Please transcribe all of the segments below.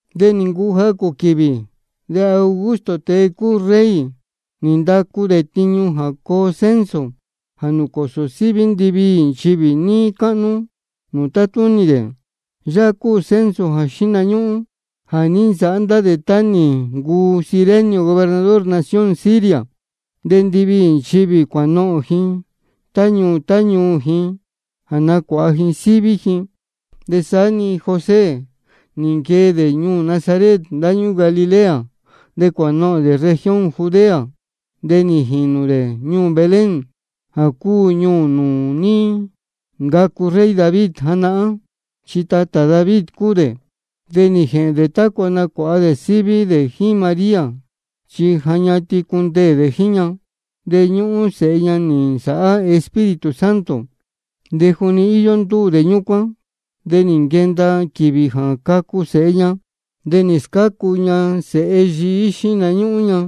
De nī ncuu jacū quīvī, de Augusto, tēe cúu rey, nī ndacu dē tiñu jā coo censo jā nūcōsō síví ndiviī nchivī níí cáhnú nūū tátúnī dē. Yáhá cúu censo jā xíhna ñúhún jā ní nsāhá ndá dē tá nī ncuu Cirenio gobernador nación Siria. De ndiviī nchivī cuānohōn ji tá ñuū tá ñuū ji jā nacuāha ji síví ji. De saá-ni José nī nquee dē ñuū Nazaret ndáñúū Galilea. De cuānohōn dē región Judea, de nī jīnū dē ñuū Belén, jā cúu ñuū nūū ní ncacu rey David janahán. Chi tatā David cúu dē. De nī jēhēn dē tácua nacuāha dē síví dē jíín María, chi ja ñatin cundeē dē jíín ña. De ñúhún sēhe ña nī nsāhá Espíritu Santo. De juni íyó ndúū dē ñúcuán de nī nquenda quīvī jā cacu sēhe ña. De nī scácu ña sēhe yií xíhna ñúhún ña,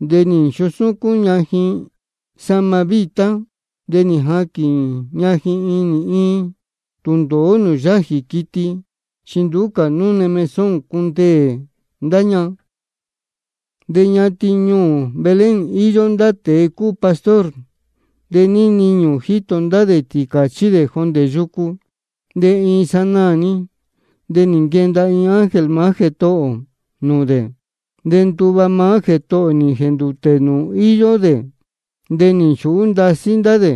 de nī nchusúcún ña ji sahma vítá, de nī jaquīn ña ji inī iin tūndōó nūū yájī quiti, chi nduú cā núne mesón cundeē ndá ña. De ñatin ñuū Belén íyó ndá tēe cúu pastor, de níí niñū jíto ndá dē tīcāchí dē jondē yucu. De iin sanaā-ni de nī nquenda iin ángel maá Jētohō ō nūū dē, de nduva maá Jētohō ō nī jēndūtē níí nūū íyó dē. De nī nchūhú ndasí ndá dē.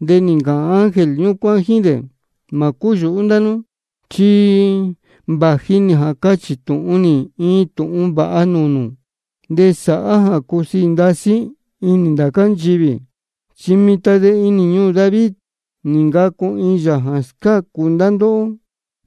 De nī ncāhān ángel ñúcuán jíín dē: Mā cúyūhú ndá nú, chi vāji nī jā cachī tūhun nī iin tūhun vāha nūū nū, de sāhá jā cusiī ndasí inī ndācá nchivī: Chi mitan de inī ñuū David nī ncacu iin Yāā jā scácu ndá ndóhó,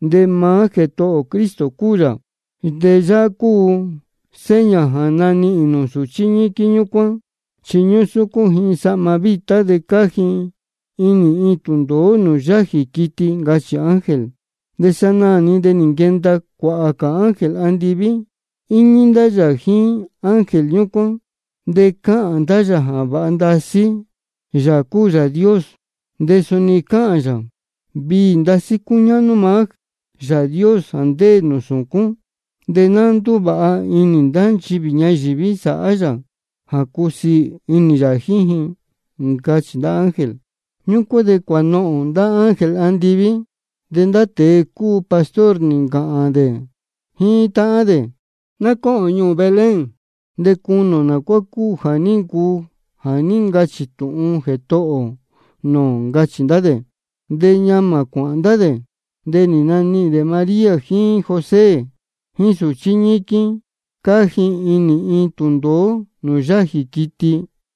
de maá Jētohō ō Cristo cúu yā. De yáhá cúu seña jā nanihīn nū sūchí ñíquín ñúcuán, chi ñúsúcún ji sahma vítá, de cáá ji inī iin tūndōó nūū yájī quiti, ncachī ángel. De sanaā-ni de nī nquenda cuāhā cā ángel andiví, íñí ndá yā jíín ángel ñúcuán, de cáhān ndá yā jā vāha ndasí Yāā cúu Yāā Dios. De suni cáhān yā: Viī ndasí cúñáhnú maá Yāā Dios jā ndéē nūū sūcún. De ná ndúvāha inī ndá nchivī ñayīví sāhá yā jā cúsiī inī yā jíín ji. Ncachī ndá ángel. Ñúcuán de cuānohōn ndá ángel andiví. De ndá tēe cúu pastor nī ncāhān dē jíín táhán dē: Ná cóhōn ñuū Belén, de cunī ō nā cuá cúu jā ní ncuu jā ní ncachī tūhun Jētohō ō nūū ō, ncachī ndá dē. De ñamā cuāhān ndá dē, de nī nanihīn dē María jíín José jíín sūchí ñíquín, cáá ji inī tūndōó nūū yájī quiti.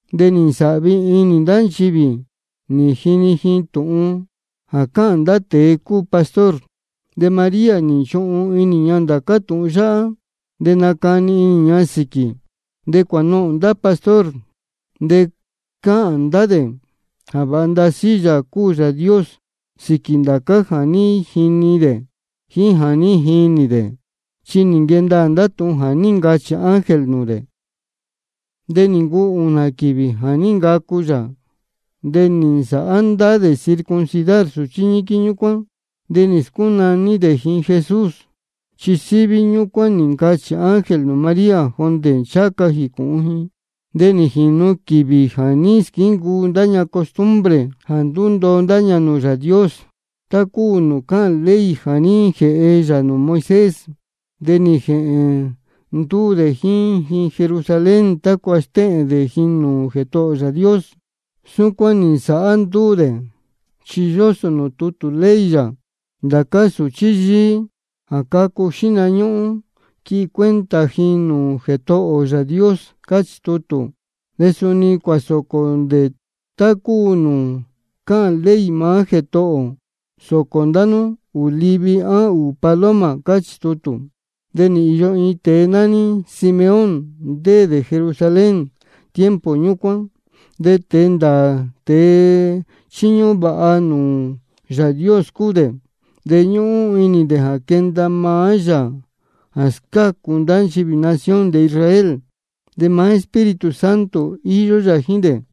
De nī nsāhvi inī ndá nchivī nī jini ji tūhun jā cáhān ndá tēe cúu pastor. De María nī nchuhun inī ña ndācá tūhun yáhá, de nácani inī ña sīquī. De cuānohōn ndá pastor, de cáhān ndá dē jā vāha ndasí Yāā cúu Yāā Dios sīquī ndācá jā ní jini dē jíín jā ní jinī dē, chi nī nquee ndaā ndá tūhun jā ní ncachī ángel nūū dē. De nī ncuu ūnā quīvī jā ní ncacu yā, de nī nsāhá ndá dē circuncidar sūchí ñíquín ñúcuán. De nī scúnaní dē ji Jesús, chi síví ñúcuán nī ncachī ángel nūū María jondē ncháha ca jīcūhun ji. De nī jīnu quīvī jā ní squíncuu ndá ña costumbre jā ndúndoo ndá ña nūū Yāā Dios, tá cúu nūū cáhān ley jā ní jēhe yā nūū Moisés. De nī jēhēn ndúū dē jíín ji Jerusalén tácua stéhēn dē ji nūū Jētohō ō Yāā Dios. Súcuán nī nsāhá ndúū dē, chi yósō nūū tutū ley yā: Ndācá sūchí yíí jā cácu xihna ñúhún, quihi cuenta ji nūū Jētohō ō Yāā Dios, cáchī tutū. De suni cuāsōcō dē tá cúu nūū cáhān ley maá Jētohō ō: Sōcō ndá nú ūū livi á ūū paloma, cáchī tutū. De nī īyo iin tēe nání Simeón, ndéē dē Jerusalén tiempo ñúcuán. De tēe ndāā tēe chíñúhún vāha nūū Yāā Dios cúu dē. De ñúhún inī dē jā quenda maá Yāā jā scácu ndá nchivī nación dē Israel. De maá Espíritu Santo íyó yā jíín dē,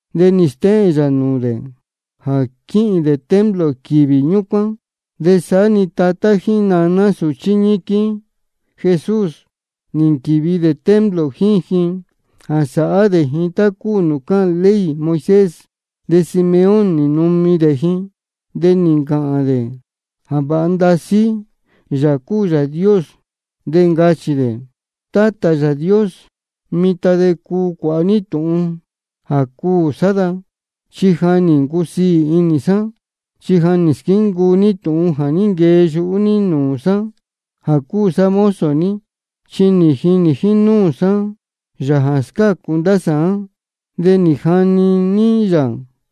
De nī stéhēn yā nūū dē jā quīhīn dē templo quīvī ñúcuán. De saá-ni tatá jíín naná sūchí ñíquín Jesús, nī nquīvi dē templo jíín ji jā sāhá dē ji tá cúu nūū cáhān ley Moisés. De Simeón nī numi ndeē dē ji, de nī ncāhān dē jā vāha ndasí Yāā cúu Yāā Dios, de ncachī dē: Tátā Yāā Dios, mitan de cuu cuāha ní tūhun jā cuū sá da, chi ja nī ncusiī inī sá, chi ja nī squíncuu ní tūhun jā ní nquee yuhú ní nūū sá jā cúu sá mozo ní. Chi nī jinī jínúū sá nūū Yāā jā scácu ndá sāán. De nī jani ní yā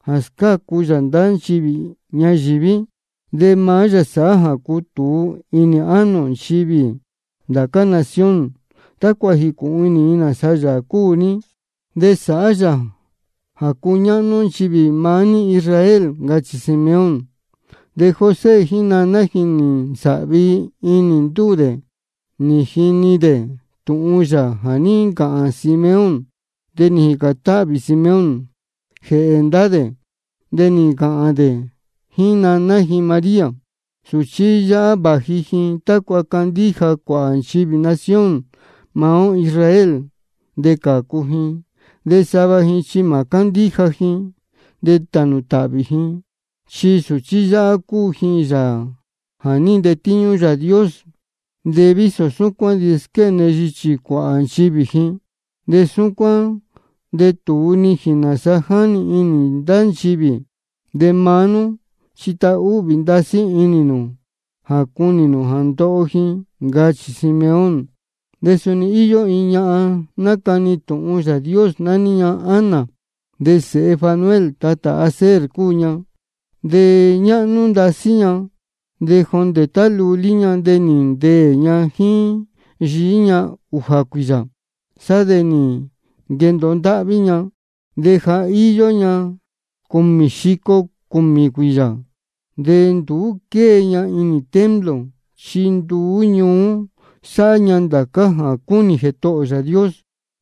jā scácu yā ndá nchivī ñayīví. De maá yā sāhá jā cutūu inī ánō nchivī ndācá nación, tácua jīcūhun inī ji nāsa Yāā cúu ní. De sāhá yā jā cuñáhnú nchivī maá ní Israel. Ncachī Simeón. De José jíín naná ji nī nsāhvi inī ndúū dē nī jini dē tūhun yā jā ní ncāhān Simeón. De nī jīcān táhvī Simeón jēhē ndá dē, de nī ncāhān dē jíín naná ji María: Sūchí yáhá vāji ji tácua candíja cuāhā nchivī nación maá ó Israel, de cācu ji. De sava ji chi mā cándíja ji, de tānū tāhvī ji. Chi sūchí yáhá cúu ji Yāā jā ní ntetíñú Yāā Dios, de vísō súcuán de squéne yichī cuāhā nchivī ji. De súcuán de tūu nijīn nāsa jáni inī ndá nchivī. De maá nú chi tahúhvī ndasí inī nū jā cunī nū jā ndoho ji, ncachī Simeón. De suni íyó iin ñahan nácani tūhun Yāā Dios, nání ña Ana. De sēhe Fanuel, tatā Aser cúu ña. De ja ñáhnú ndasí ña. De jondē tá lulí ña de nī ndeē ña jíín yií ña ūjā cuīyā. Sá de nī nquendōo ndáhví ña, de ja íyó ña cūmī xico cūmī cuīyā. De nduú quée ña inī templo, chi nduú ñuú sáhá ña ndācá jā cúnī Jētohō ō Yāā Dios,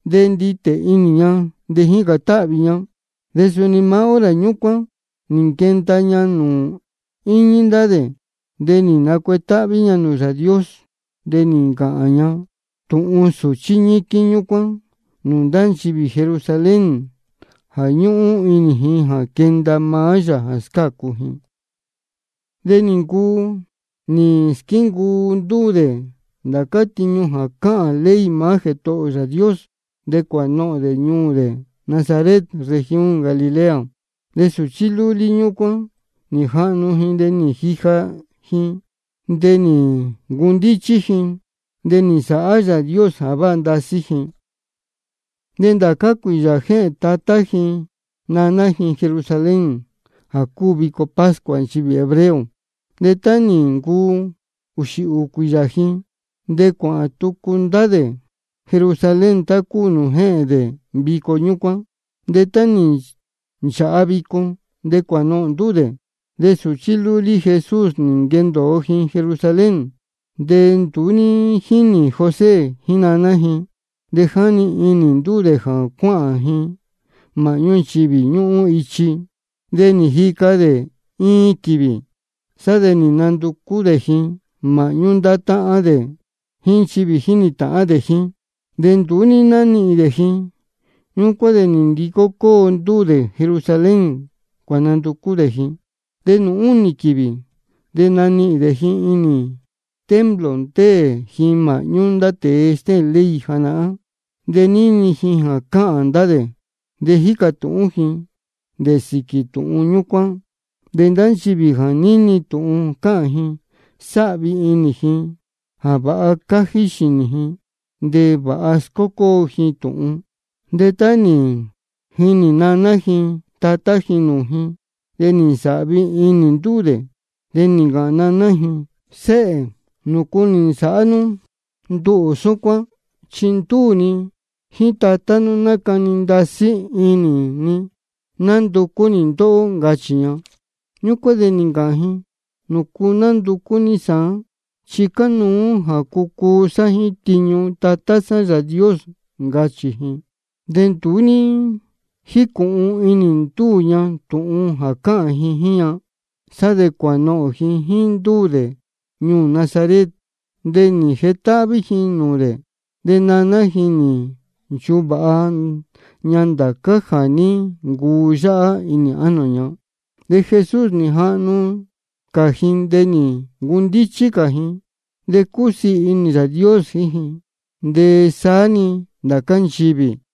de nditē inī ña de jícān táhvī ña. De suni maá hora ñúcuán nī nquenda ña nūū íñí ndá dē, de nī nacuetáhví ña nūū Yāā Dios. De nī ncachī ña tūhun sūchí ñíquín ñúcuán nūū ndá nchivī Jerusalén jā ñúhún inī ji jā quenda maá Yāā jā scácu ji. De nī ncuu nī squíncuu ndúū dē ndācá tiñu jā cáhān ley maá Jētohō ō Yāā Dios, de cuānohōn dē ñuū dē Nazaret región Galilea. De sūchí lúlí ñúcuán nī jahnu ji, de nī jija ji, de nī ncundíchí ji. De nī nsāhá Yāā Dios jā váha ndasí ji. De ndācá cuīyā jéhēn tatá ji naná ji Jerusalén, jā cúu vico pascua nchivī hebreo. De tá nī ncuu ūxī ūū cuīyā ji, de cuāhān tucu ndá dē Jerusalén, tá cúu nūū jéhēn dē vico ñúcuán. De tá nī nchāha vico, de cuānohōn ndúū dē. De sūchí lúlí Jesús nī nquendōo ji Jerusalén, de nduú ní jínī José jíín naná ji. De jáni inī ndúū dē jā cuáhān ji māhñú nchivī ñúhún ichi. De nī jica dē iin quīvī, sá de nī nanducú dē ji māhñú ndá táhán dē jíín nchivī jínī tāhán dē jíín. De nduú ní nánihīn dē ji. Ñúcuán de nī ndicó cóo ndúū dē Jerusalén, cuānanducú dē ji. De nūū únī quīvī de nī nanihīn dē ji inī templo, ndéē ji māhñú ndá tēe stéhēn ley janahán, de níni ji jā cáhān ndá dē, de jícā tūhún ji dē sīquī tūhun ñúcuán. De ndá nchivī jā níni tūhun cáhān ji, sáhvi inī ji jā vāha cájí xīnī ji de vāha scócóo ji tūhun. De tá nī jinī naná ji tatá ji nūū ji, de nī nsāhvi inī ndúū dē. De nī ncāhān naná ji: Séhē, ¿nūcu nī nsāhá nú nduhū súcuán? Chi ndúū ni jíín tatá nú, nácani ndasí inī ni nánducú nī ndóhó, ncachī ña. Ñúcuán de nī ncāhān ji: ¿Nūcu nánducú ní sāán? Chi cánuú jā cucuu sá jíín tiñu Tatá sá Yāā Dios, ncachī ji. De nduú ní jícūhun inī ndúū ña tūhun cáhān ji jíín ña. Sá de cuānohōn ji jíín ndúū dē ñuū Nazaret, de nī jetáhví ji nūū dē. De naná ji nī nchuvāha ña ndācá jā ní ncuu yáhá inī ánō ña. De Jesús nī jahnu cā ji de nī ncundíchí cā ji. De cúsiī inī Yāā Dios jíín ji, de saá-ni ndācá nchivī.